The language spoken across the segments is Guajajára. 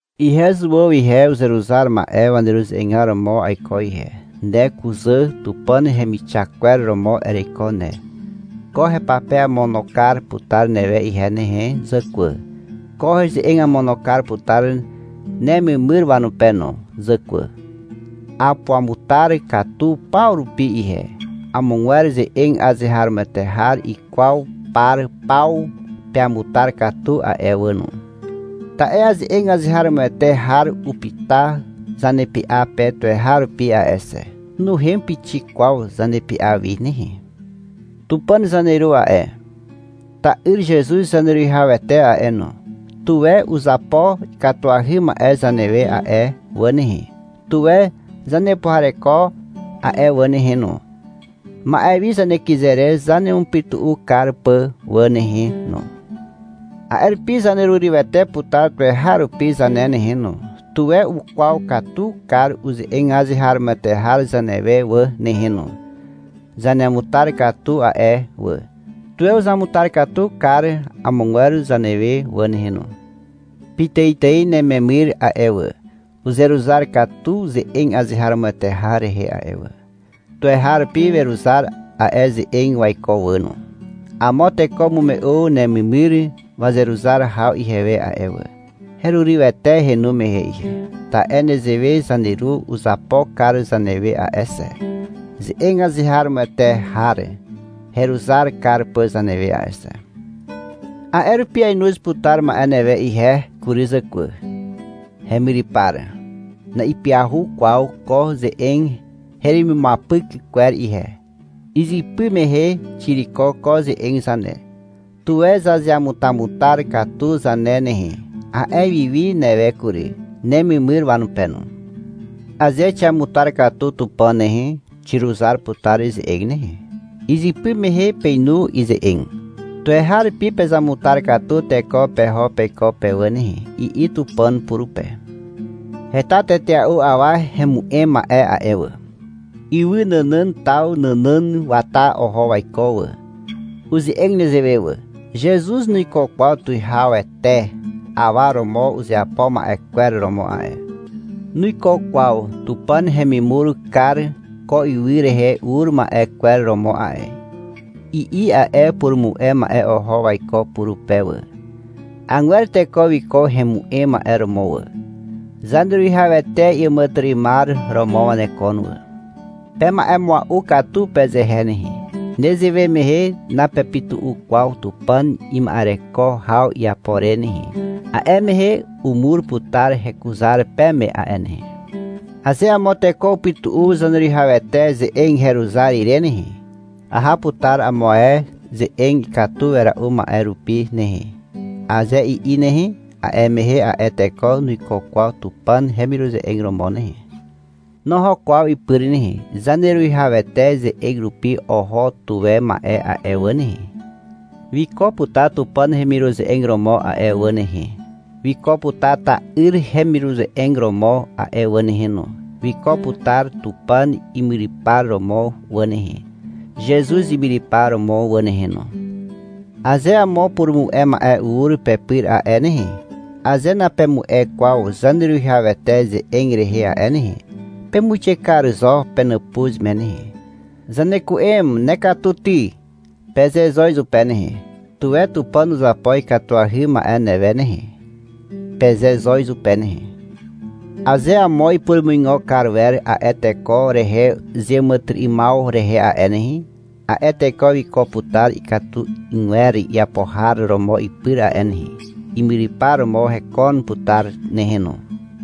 Ihe Zuàw ihe, uzeruzar ma'e waneruze'egar romo aiko ihe. Ne kuzà Tupàn hemixak kwer romo ereiko ne. Ko hepape amono kar putar newe ihe nehe zàkwà. Ko heze'eg amono kar putar nememyr wanupe no, zàkwà. Apuamutar katu paw rupi ihe. Amogwer ze'eg azeharomoete har ikwaw par paw peamutar katu a'e wà no. Ta'e ze'eg azeharomoete har upyta zanepy'a pe tuweharupi a'e xe. Nuhem pixik kwaw zanepy'a wi nehe. Tupàn zaneru a'e, ta'yr Zezuz Zaneruwihawete a'e no, tuwe uzapo ikatuahy ma'e zanewe a'e wà nehe. Tuwe zanepuhareko a'e wà nehe no, ma'e wi zanekyze re zanemupytu'u kar pà wà nehe no. A'e rupi zanerurywete putar tuweharupi zane nehe no. Tuwe ukwaw katu kar uze'eg azeharomoete har zanewe wà nehe no. Zaneamutar katu a'e wà. Tuwe uzamutar katu kar amogwer zanewe wà nehe no. Pitàitài nememyr a'e wà, uzeruzar katu ze'eg azeharomoete har rehe a'e wà. Tuweharupi weruzar a'e ze'eg waiko wà no. Amo teko umume'u nememyr wazeruzar haw ihewe a'e wà. Herurywete henu mehe ihe. Ta'e nezewe zaneru uzapo kar zanewe a'e xe, ze'eg azeharomoete har heruzar kar pà zanewe a'e xe. A'e rupi ainoz putar ma'e newe ihe kury zàkwà, hemyrypar. Na'ipyahu kwaw ko ze'eg heremimuapyk kwer ihe. Izypy mehe xiriko ko ze'eg zane. — Tuwe zazeamutamutar katu zane nehe, a'e wiwi newe kury, nememyr wanupe no. Aze xiamutar katu Tupàn nehe, xiruzar putar ize'eg nehe. Izypy mehe peinu ize'eg. — Tuweharupi pezamutar katu teko peho peiko pe wà nehe, i'i Tupàn purupe. Heta tetea'u awa hemu'em ma'e a'e wà. Ywy nànàn taw nànàn wata oho waiko wà. Uze'eg nezewe wà. — Zezuz nuiko kwaw tuwihawete awa romo uzeapo ma'e kwer romo a'e. Nuiko kwaw Tupàn hemimur kar ko ywy rehe ur ma'e kwer romo a'e, i'i a'e purumu'e ma'e oho waiko purupe wà. Agwer teko wiko hemu'em ma'e romo wà. Zaneruwihawete iàmàtyry'ymar romo wanekon wà. Pema'emua'u katu pezehe nehe, nezewe mehe napepytu'u kwaw Tupàn ima'ereko haw iapo re nehe. A'e mehe umur putar hekuzar peme a'e nehe. Aze amo teko upytu'u Zaneruwihawete ze'eg heruzar ire nehe, — Aha putar amo ae ze'eg ikatu wera'u ma'e rupi nehe, aze i'i nehe, a'e mehe a'e teko nuiko kwaw Tupàn hemiruze'eg romo nehe. Noho kwaw ipyr nehe. Zaneruwihawete ze'eg rupi oho tuwe ma'e a'e wà nehe, wiko putar Tupàn hemiruze'eg romo a'e wà nehe. Wiko putar ta'yr hemiruze'eg romo a'e wà nehe no. Wiko putar Tupàn imyrypar romo wà nehe, Zezuz imyrypar romo wà nehe no. Aze amo purumu'e ma'e ur pepyr a'e nehe, aze napemu'e kwaw Zaneruwihawete ze'eg rehe a'e nehe, pemuixe kar zo penàpuz me nehe. — Zaneku'em, nekatu ty, peze zo izupe nehe. — Tuwe Tupàn uzapo ikatuahy ma'e newe nehe, peze zo izupe nehe. Aze amo ipurumuigo kar wer a'e teko rehe zeàmàtyry'ymaw rehe a'e nehe, a'e teko wiko putar ikatu 'ygwer iapo har romo ipyr a'e nehe. Imyrypar romo hekon putar nehe no.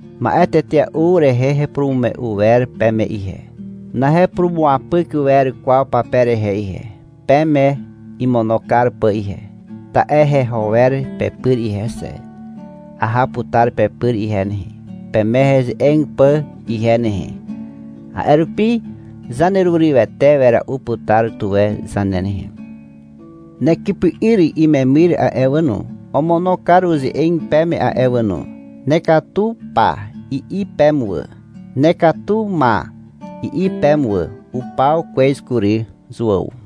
Ma'e tetea'u rehe hepurumume'u wer peme ihe. Nahepurumuapyk wer kwaw pape rehe ihe, peme imono kar pà ihe. Ta'e heho wer pepyr ihe xe. Aha putar pepyr ihe nehe, peme heze'eg pà ihe nehe. A'e rupi zanerurywete wera'u putar tuwe zane nehe. Nekypy'yr imemyr a'e wà no, omono kar uze'eg peme a'e wà no, — Nekatu pa, i'i peme wà. — Nekatu ma, i'i peme wà. Upaw kwez kury. Zuàw.